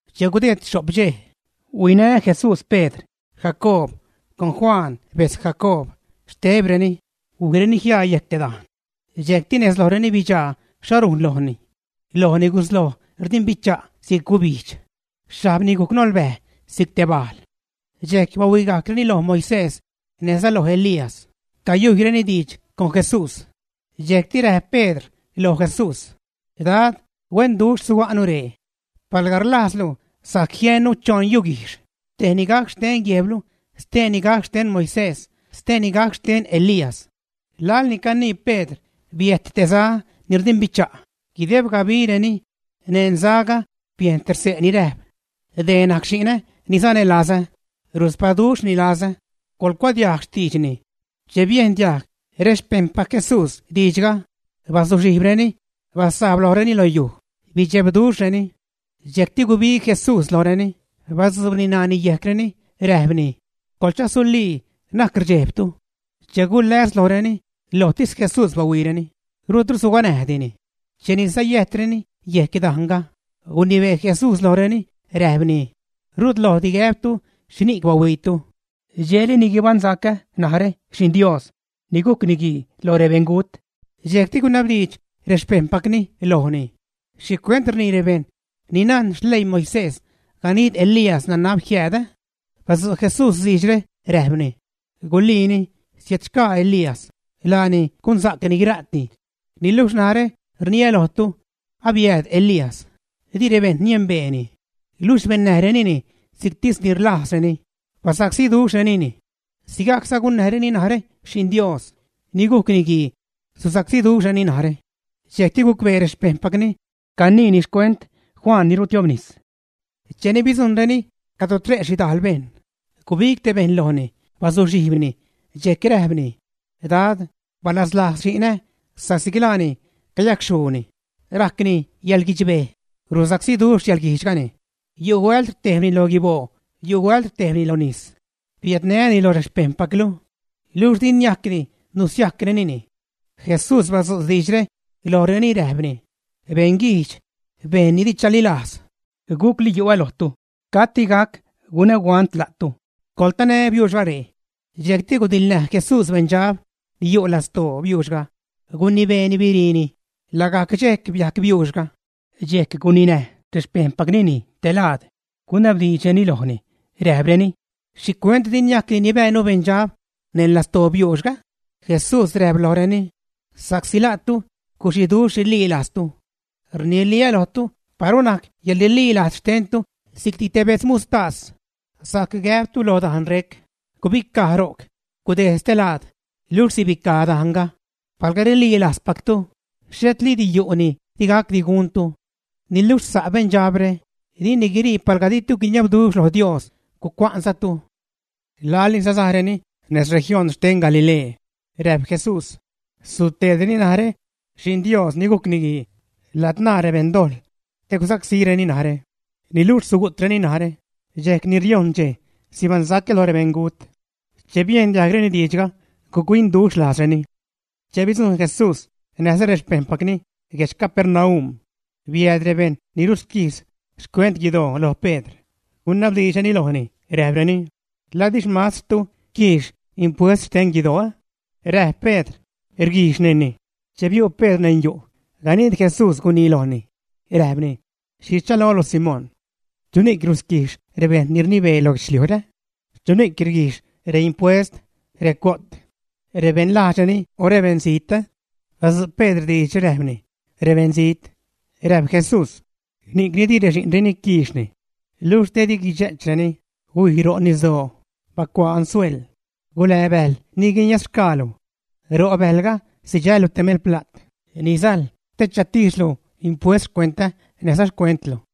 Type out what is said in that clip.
Che gudeed xho'p dxej, huinä Jesús Pedr, Jacoob, con Juan betz Jacoob, xtebreni huijreni jiaa yejc te dajn. Dxejcti nez lojreni bidxaa xho rujn lojni. Lojni gusloj rdimbicha' si'c gubijdx; xhajbni gujc nolbäj si'c te bajl. Dxejc bahuigajcreni loj Moisés näjza loj Elías, cayujyreni diidx con Jesús. Dxejcti räjp Pedr loj Jesús: ―Dad, ¡huenduxh suga'nu ree! Palga rlajzlu, sajc jiennu choṉ yuguijxh, tejni gac xten guejblu, steeni gac xten Moisés, steeni gac xten Elías. Laḻni canii Pedr, biäjt te za ni rdimbicha' guideb gabireni; neṉ zaga biejn te xse' ni räjp: ―Dee najc xi'nä ni sanälazä, ruspaduxhni lazä, coḻcuadiajg xtiidxni. Che biejn diajg rexpejṉpac Jesús diidxga, bazuxhijbreni, basajbreni lojreni lo yuj, bidxebduxhreni. Dxejcti gubig Jesús lojreni, batzuubni ṉaani yejcreni, räjpni: ―Coḻchasulii, na'c rdxejbtu. Che guläs lojreni, lojtis Jesús bahuiireni, rutru suganäjdini. Cheni sayäjtreni yejc dajnga, gunibee Jesús lojreni, räjpni: ―Rutlojdi gäbtu xhini'c bahuiitu dxejli ni guibaṉsacä narä Xi'n Dios ni gujc Niguii lo rebeṉgut. Dxejcti gunabdiidx rexpejṉpacni lojni: ―¿Xhicuent rnii rebejṉ ni najn xleii Moisés ganid Elías nanab jiääd, ä? Badzu' Jesús diidxre, räjpni: ―Guliini siädxgaa Elías, laani gunsa'cni guira'ti, niluxh narä rniä lojtu, abiääd Elías, di rebejṉ nienbeeni, luxh bennäjrenini si'ctis ni rlajzreni, basacsíduxhrenini. Sigajcza gunnäjreni narä Xi'n Dios ni gujc Niguii, susacsíduxhreni narä. Dxejcti gucbee rexpejṉpacni caniini xcuent Juan Bautist. Cheni bidzujṉreni cadro tre' xhidajl bejṉ, gubig te bejṉ lojni bazuxhijbni, dxejc räjpni: ―Dad, balaslajz xinä sa'csi laani cayacxhuuni, rajcni yäḻguidxbej, rusacsíduxh yäḻguijdxgani, yu' huält rtejbni lo guiboo yu' huält rtejbni lo nis. Biädnää́ni loj rexpejṉpaclu, luxh di niajcdi nusiajcrenini. Jesús badzu' diidxre lojreni räjpni: ―Beṉguijdx, bejṉ ni di chalilajz, ¿gucli yu'ä lojtu? ¿Cati gac gunä huant la'tu? ¡Coḻtanä biuuxga ree! Dxejcti gudiḻnäj Jesús beṉdxab ni yu' lastoo biuuxga, gunibeeni biriini, lagajc dxejc biajc biuuxga. Dxejc guninäj rexpejṉpacni Jesús te laad, gunabdiidxreni räjpreni: ―¿Xhicuent di niajcdi nibäänu beṉdxab neṉ lastoo biuuxga? Jesús räjp lojreni: ―Sa'csi la'tu guxiduxh rililajztu. Rniliä́ lojtu, paru najc yäḻrililajz xtentu si'cti te bejdz muxhtas, sajc gäbtu loj dajn rec: “Gubicaj ro'c, gudejd stelaad”, luxh sibicaj dajnga. Palga rililajzpactu, xhetliidi yu' ni di gacdi guntu. Niluxh sa' beṉdxabre, dini guirii palga ditu guiniabduxh lo Dios, gucua'nzatu. Laḻni sasajreni nez región xten Galilee, räjp Jesús: ―Suteedreni narä Xi'n Dios ni gujc Niguii ladzṉaa rebeṉdojḻ te gusacsíreni narä. Niluxh sugu'treni narä, dxejc ni riojṉ dxej sibaṉsacä lo rebeṉgut. Che biejn diajgreni diidxga, guc-huinduxh lajzreni. Che bidzujṉ Jesús näjza rexpejṉpacni guedx Capernaum, biääd rebejṉ ni rusquijx xcuent guidoo lo Pedr, gunabdiidxreni lojni, räjpreni: ―¿La di xmastrtu quiix impuest xten guidoo? Räjp Pedr: ―Rguijxnini. Che biu' Pedr neṉ yu', ganid Jesús gunii lojni, räjpni: ―¿Xhi rchalolu, Simón? ¿Chuni'c rusquijx rebejṉ ni rnibee lo guedxliujre? ¿Chuni'c rguijx reimpuest, recuyo't? ¿Rebeṉ lajdxreni o rebeṉzijt? Badzu' Pedr diidxre räjpni: ―Rebeṉzijt. Räjp Jesús: ―Ni'cni di rexi'nreni quiixni. Luxh te di guidxe'chreni, huij ro' nisdoo, bacuaa ansuel, gulää bäjl ni guiniazxgaalu. Ro' bäjlga sidxällu te melpla't ni sajl te chatijxlu impuest xcuentä näjza xcuentlu.